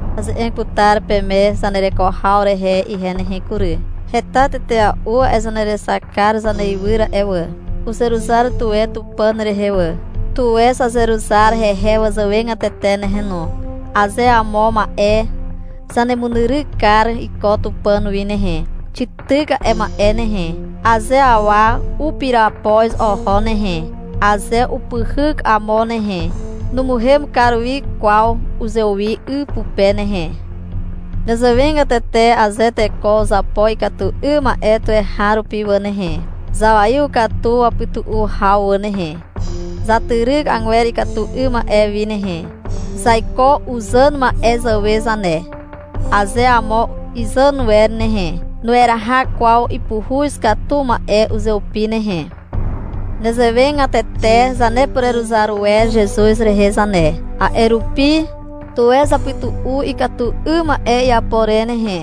Aze'eg putar peme zanereko haw rehe ihe nehe kury. Heta tetea'u a'e zanerexakar zaneiwyr a'e wà. Uzeruzar tuwe Tupàn rehe wà. Tuwe zazeruzar hehe wazàwegatete nehe no. Aze amo ma'e zanemunyryk kar iko Tupàn wi nehe, xityk a'e ma'e nehe. Aze awa upirapoz oho nehe, aze upyhyk amo nehe, numuhem kar wi kwaw uzewi 'y pupe nehe. Nezewegatete aze teko uzapo ikatu 'ym ma'e tuweharupi wà nehe, zawaiw katu wapytu'u haw wà nehe. Zatyryk agwer ikatu 'ym ma'e wi nehe. Zaiko uzàn ma'e zàwe zane. Aze amo izàn wer nehe, nueraha kwaw ipuhuz katu ma'e uzeupi nehe. Nezewegatete zanepureruzar wer Zezuz rehe zane. A'e rupi, tuwe zapytu'u ikatu 'ym ma'e iapo re nehe.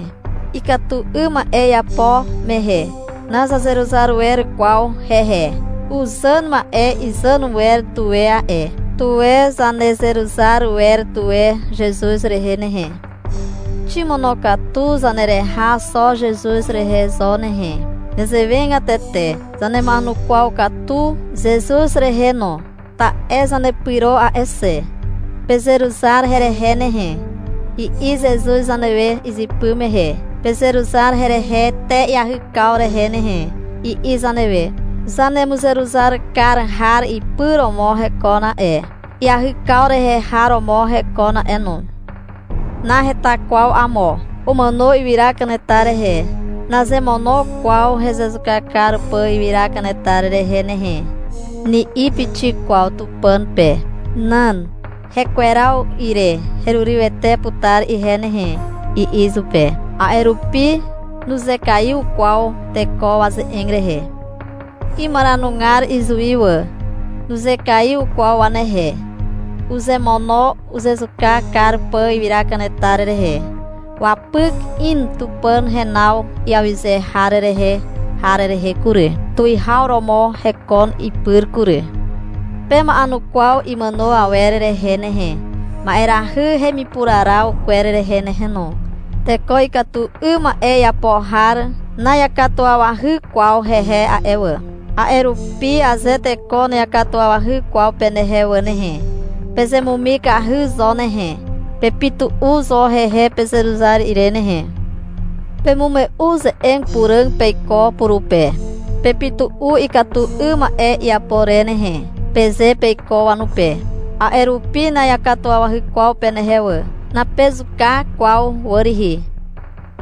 Ikatu 'ym ma'e iapo mehe nazanezeruzar wer kwaw hehe. Uzàn ma'e izàn wer tuwe a'e. Tuwe zanezeruzar wer tuwe Zezuz rehe nehe. Ximonokatu zanereha xo Zezuz rehe zo nehe. Nezewegatete zanema'enukwaw katu Zezuz rehe no, ta'e zanepyro a'e xe. — Pezeruzar herehe nehe, i'i Zezuz zanewe izypy mehe. — Pezeruzar herehe te iahykaw rehe nehe, i'i zanewe. Zanemuzeruzar kar har ipy romo hekon a'e, iahykaw rehe har romo hekon a'e no. Naheta kwaw amo. Umàno ywyra kanetar rehe. — Nazemono kwaw hezezuka kar pà ywyra kanetar rehe nehe, ni'i pixik kwaw Tupàn pe. Nan. — Hekweraw ire herurywete putar ihe nehe, i'i izupe. A'e rupi nuzekaiw kwaw teko waze'eg rehe. Imaranugar izuwi wà. Nuzekaiw kwaw wanehe. Uzemono uzezuka kar pà ywyra kanetar rehe. Wapyk in Tupàn henaw iawyze har rehe har rehe kury. Tuwihaw romo hekon ipyr kury. Pema'enukwaw imàno awer rehe nehe, ma'erahy hemipuraraw kwer rehe nehe no. Teko ikatu 'ym ma'e iapo har na'iakatuwawahy kwaw hehe a'e wà. A'e rupi aze teko na'iakatuwawahy kwaw penehe wà nehe, pezemumikahy zo nehe. Pepytu'u zo hehe pezeruzar ire nehe. Pemume'u ze'eg puràg peiko purupe. — Pepytu'u ikatu 'ym ma'e iapo re nehe, peze peiko wanupe. A'e rupi na'iakatuwawahy kwaw penehe wà. Napezuka kwaw wà rihi.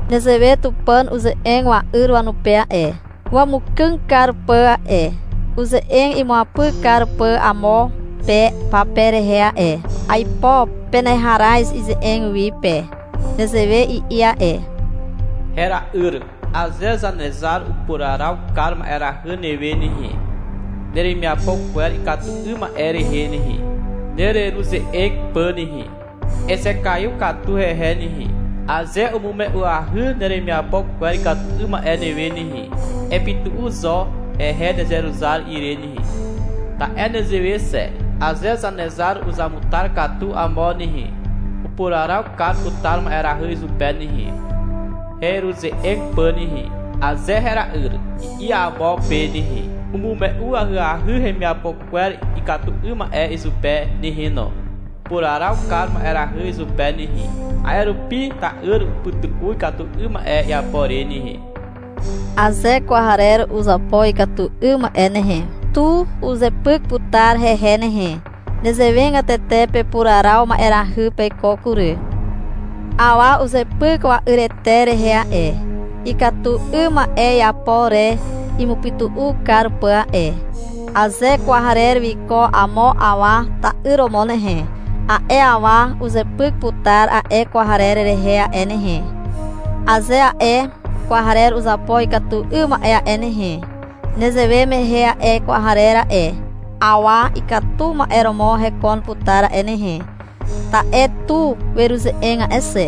Nezewe Tupàn uze'eg wa'yr wanupe a'e, wamukàg kar pà a'e, uze'eg imuapyk kar pà amo pe pape rehe a'e. Aipo peneharaz ize'eg wi pe. Nezewe i'i a'e. — Hera'yr, aze Zanezar upuraraw kar ma'erahy newe nehe, neremiapo kwer ikatu 'ym ma'e rehe nehe, nereruze'eg pà nehe, ezekaiw katu hehe nehe. Aze umume'uahy neremiapo kwer ikatu 'ym ma'e newe nehe, epytu'u zo hehe nezeruzar ire nehe. Ta'e nezewe xe. Aze Zanezar uzamutar katu amo nehe, upuraraw kar putar ma'erahy izupe nehe, heruze'eg pà nehe. Aze — Hera'yr, i'i amo pe nehe, umume'u ahyahy hemiapo kwer ikatu 'ym ma'e izupe nehe no. Upuraraw kar ma'erahy izupe nehe. A'e rupi ta'yr upytu'u ikatu 'ym ma'e iapo re nehe. Aze kwarer uzapo ikatu 'ym ma'e nehe, tu uzepyk putar hehe nehe. Nezewegatete pepuraraw ma'erahy peiko kury. Awa uzepyk wa'yrete rehe a'e, ikatu 'ym ma'e iapo re imupytu'u kar pà a'e. Aze kwarer wiko amo awa ta'yr romo nehe, a'e awa uzepyk putar a'e kwarer rehe a'e nehe, aze a'e kwarer uzapo ikatu 'ym ma'e a'e nehe. (Nezewe mehe a'e kwarer a'e, awa ikatu ma'e romo hekon putar a'e nehe, ta'e tu weruze'eg a'e xe.)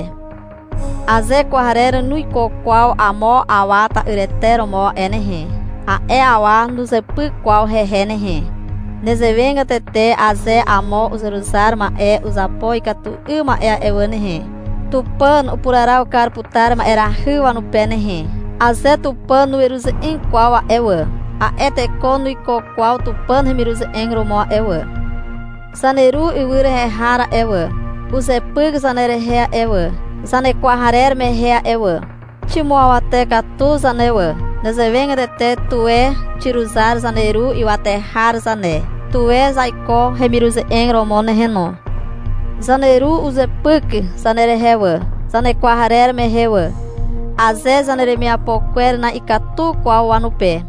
Aze kwarer nuiko kwaw amo awa ta'yrete romo a'e nehe, a'e awa nuzepyk kwaw hehe nehe. Nezewegatete aze amo uzeruzar ma'e uzapo ikatu 'ym ma'e wà nehe, Tupàn upuraraw kar putar ma'erahy wanupe nehe. Aze Tupàn nueruze'eg kwaw a'e wà, a'e teko nuiko kwaw Tupàn hemiruze'eg romo a'e wà. Zaneru ywy rehe har a'e wà, uzepyk zanerehe a'e wà, zanekwarer mehe a'e wà. Ximuawate katu zane wà. Nezewegatete tuwe xiruzar zaneru ywate har zane. Tuwe zaiko hemiruze'eg romo nehe no. Zaneru uzepyk zanerehe wà, zanekwarer mehe wà, aze zaneremiapo kwer na'ikatu kwaw wanupe.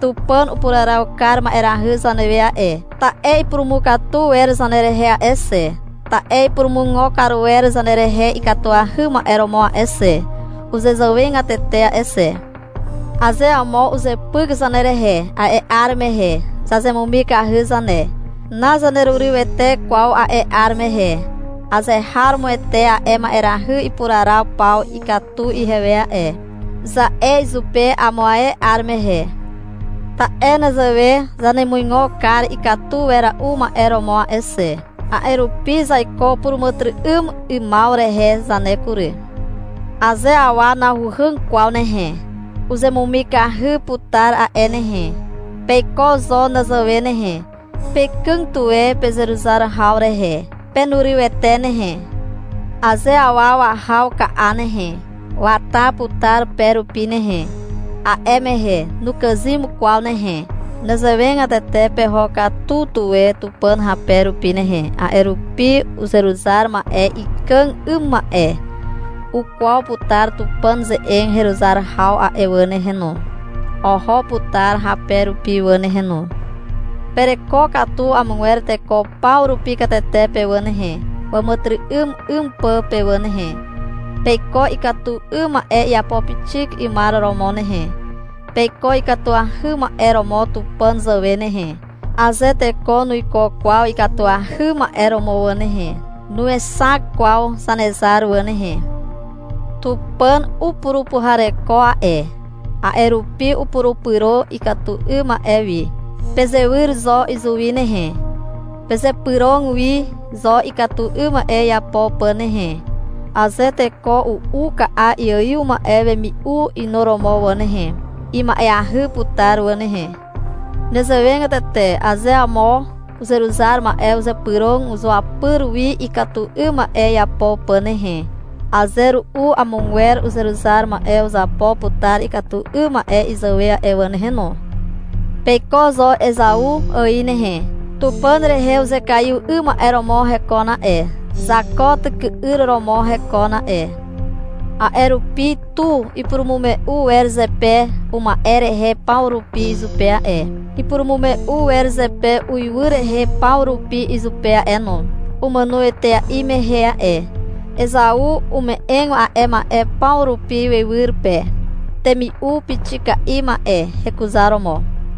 Tupàn upuraraw kar ma'erahy zanewe a'e, ta'e ipurumukatu wer zanerehe a'e xe. Ta'e ipurumuigo kar wer zanerehe ikatuahy ma'e romo a'e xe, uzezàwegatete a'e xe. Aze amo uzepyk zanerehe, a'e 'ar mehe zazemumikahy zane. Nazanerurywete kwaw a'e 'ar mehe. — Azeharomoete a'e ma'erahy ipuraraw paw ikatu ihewe a'e, za'e izupe amo ae 'ar mehe. Ta'e nezewe zanemuigo kar ikatu wera'u ma'e romo a'e xe. A'e rupi zaiko puràmàtyry'ym 'ymaw rehe zane kury. Aze awa nahuhàg kwaw nehe, uzemumikahy putar a'e nehe. Peiko zo nezewe nehe. Pekàg tuwe pezeruzar haw rehe. Penurywete nehe. Aze awa wahaw ka'a nehe, wata putar pe rupi nehe. A'e mehe nukàzym kwaw nehe. Nezewegatete peho katu tuwe Tupàn hape rupi nehe. A'e rupi uzeruzar ma'e ikàg 'ym ma'e ukwaw putar Tupàn ze'eg heruzar haw a'e wà nehe no. Oho putar hape rupi wà nehe no. Pereko katu amogwer teko paw rupi katete pe wà nehe, wàmàtyry'ym 'ym pà pe wà nehe. Peiko ikatu 'ym ma'e iapo pixik 'ymar romo nehe. Peiko ikatuahy ma'e romo Tupàn zàwe nehe. Aze teko nuiko kwaw ikatuahy ma'e romo wà nehe, nuexak kwaw Zanezar wà nehe. Tupàn upurupuhareko a'e. A'e rupi upurupyro ikatu 'ym ma'e wi. Pezewyr zo izuwi nehe. Pezypyrog wi zo ikatu 'ym ma'e iapo pà nehe. Aze teko u'u ka'a iaiw ma'e wemi'u inuromo wà nehe, ima'eahy putar wà nehe. Nezewegatete aze amo uzeruzar ma'e uzypyrog zuapyr wi ikatu 'ym ma'e iapo pà nehe, aze ru'u amogwer uzeruzar ma'e uzapo putar ikatu 'ym ma'e izàwe a'e wà nehe no. Peiko zo Ezau ài nehe. Tupàn rehe uzekaiw 'ym ma'e romo hekon a'e. Zako tyky'yr romo hekon a'e. A'e rupi tu ipurumume'u wer zepe uma'e rehe paw rupi izupe a'e, ipurumume'u wer zepe uiwy rehe paw rupi izupe a'e no, umàno etea'i mehe a'e. Ezau ume'eg a'e ma'e paw rupi wywyr pe, temi'u pixika'i ma'e hekuzaromo.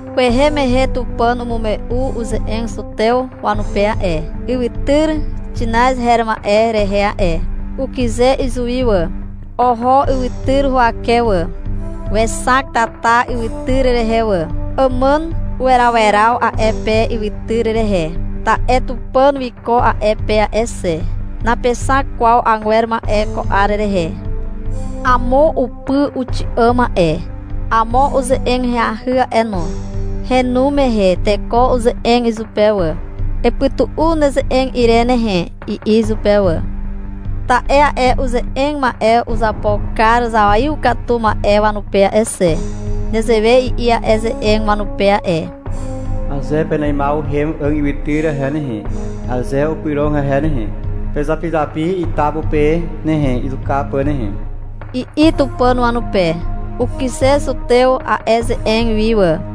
Kwehe mehe Tupàn umume'u uze'eg zutew wanupe a'e, ywytyr Xinaz her ma'e rehe a'e. Ukyze izuwi wà. Oho ywytyr huwake wà. Wexak tata ywytyr rehe wà. Ipytun a'e pe. Àmàn uweraweraw a'e pe ywytyr rehe. Ta'e Tupàn wiko a'e pe a'e xe. Napexak kwaw agwer ma'e ko 'ar rehe. Amo upy uxi'àm a'e. Amo uze'eg ahyahy a'e no. Henu mehe teko uze'eg izupe wà. — Epytu'u neze'eg ire nehe, i'i izupe wà. Ta'e a'e uze'eg ma'e uzapo kar zawaiw katu ma'e wanupe a'e xe. Nezewe i'i a'e ze'eg wanupe a'e. — Aze peneimaw uhem 'àg ywytyr rehe nehe, aze upyrog hehe nehe, pezapizapi ita pupe nehe, izuka pà nehe, i'i Tupàn wanupe. Ukyze zutew a'e ze'eg wi wà.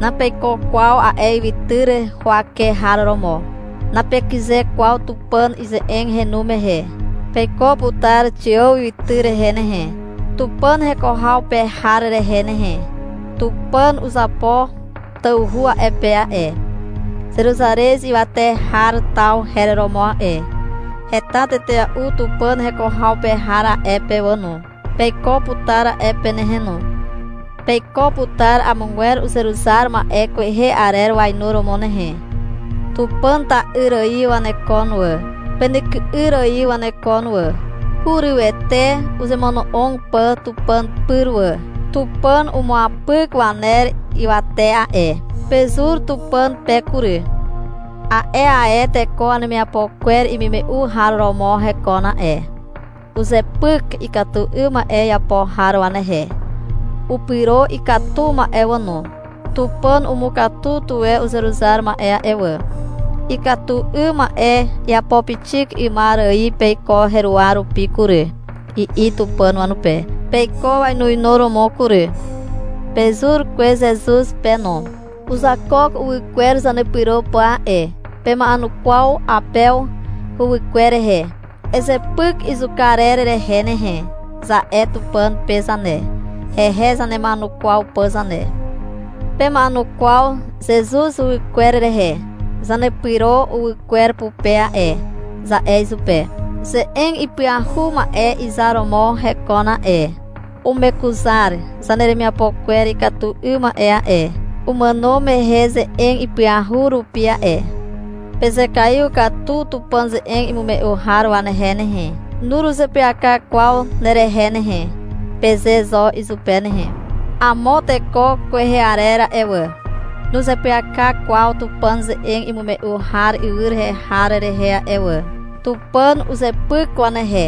Napeiko kwaw a'e ywytyr huwake har romo. Napekyze kwaw Tupàn ize'eg henu mehe. Peiko putar Xiàw ywytyr rehe nehe, Tupàn heko haw pe har rehe nehe. Tupàn uzapo tawhu a'e pe a'e. Zeruzarez ywate har taw her romo a'e. Heta tetea'u Tupàn heko haw pe har a'e pe wà no. Peiko putar a'e pe nehe no. Peiko putar amogwer uzeruzar ma'e kwehe arer wainuromo nehe. Tupàn ta'yr ài wanekon wà. Penyky'yr ài wanekon wà. Hurywete uzemono'og pà Tupàn pyr wà. Tupàn umuapyk waner ywate a'e. Pezur Tupàn pe kury. A'e ae teko wanemiapo kwer paw imume'u har romo hekon a'e. Uzepyk ikatu 'ym ma'e iapo har wanehe. Upyro ikatu ma'e wà no. Tupàn umukatu tuwe uzeruzar ma'e a'e wà. — Ikatu 'ym ma'e iapo pixik 'ymar ài peiko heruwa rupi kury, i'i Tupàn wanupe. Peiko wainuinuromo kury. Pezur kwez Zezuz pe no. Uzakook uwy kwer zanepyro pà a'e. Pema'enukwaw Apew huwykwer rehe. — Ezepyk izuka arer rehe nehe, za'e Tupàn pe zane, hehe zanema'enukwaw pà zane. Pema'enukwaw Zezuz huwykwer rehe. — Zanepyro uwy kwer pupe a'e, za'e izupe. Ze'eg ipyahu ma'e izar romo hekon a'e. Umekuzar zaneremiapo kwer ikatu 'ym ma'e a'e, umàno mehe ze'eg ipyahu rupi a'e. Pezekaiw katu Tupàn ze'eg imume'u har wanehe nehe. — Nuruzeapyaka kwaw nerehe nehe, peze zo izupe nehe. Amo teko kwehe arer a'e wà, nuzeapyaka kwaw Tupàn ze'eg imume'u har ywy rehe har rehe a'e wà. Tupàn uzepyk wanehe.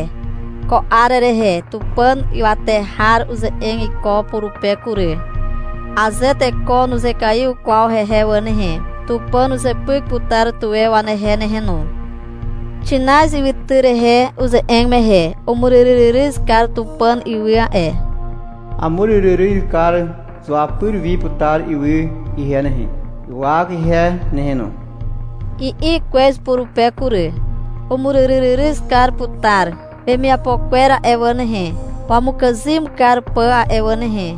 Ko 'ar rehe Tupàn ywate har uze'eg iko purupe kury. Aze teko nuzekaiw kwaw hehe wà nehe, Tupàn uzepyk putar tuwe wanehe nehe no. Xinaz ywytyr rehe uze'eg mehe umuryryryryz kar Tupàn ywy a'e. — Amuryryryryz kar zuapyr wi putar ywy ihe nehe, ywak ihe nehe no, i'i kwez purupe kury. Umuryryryryz kar putar wemiapo kwer a'e wà nehe, wamukàzym kar pà a'e wà nehe.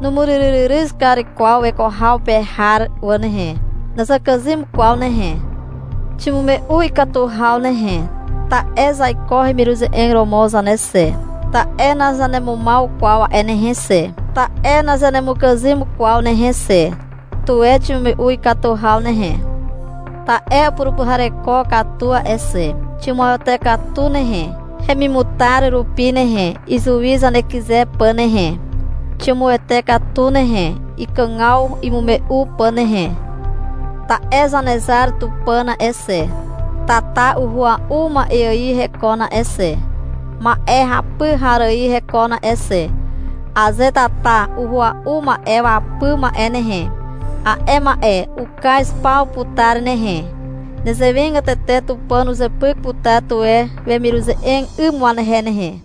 Numuryryryryz kar kwaw weko haw pe har wà nehe. (Nazakàzym kwaw nehe.) Ximume'u ikatu haw nehe. Ta'e zaiko hemiruze'eg romo zane xe. Ta'e nazanemumaw kwaw a'e nehe xe. Ta'e nazanemukàzym kwaw nehe xe. Tuwe ximume'u ikatu haw nehe. Ta'e upurupuhareko katu a'e xe. Ximuawate katu nehe, hemimutar rupi nehe, izuwi zanekyze pà nehe. Ximuete katu nehe, ikàgaw imume'u pà nehe. Ta'e Zanezar Tupàn a'e xe, tata uhua'u ma'e ài hekon a'e xe, ma'e hapy har ài hekon a'e xe. Aze tata uhua'u ma'e wapy ma'e nehe, a'e ma'e ukaz paw putar nehe. Nezewegatete Tupàn uzepyk putar tuwe wemiruze'eg 'ym wanehe nehe.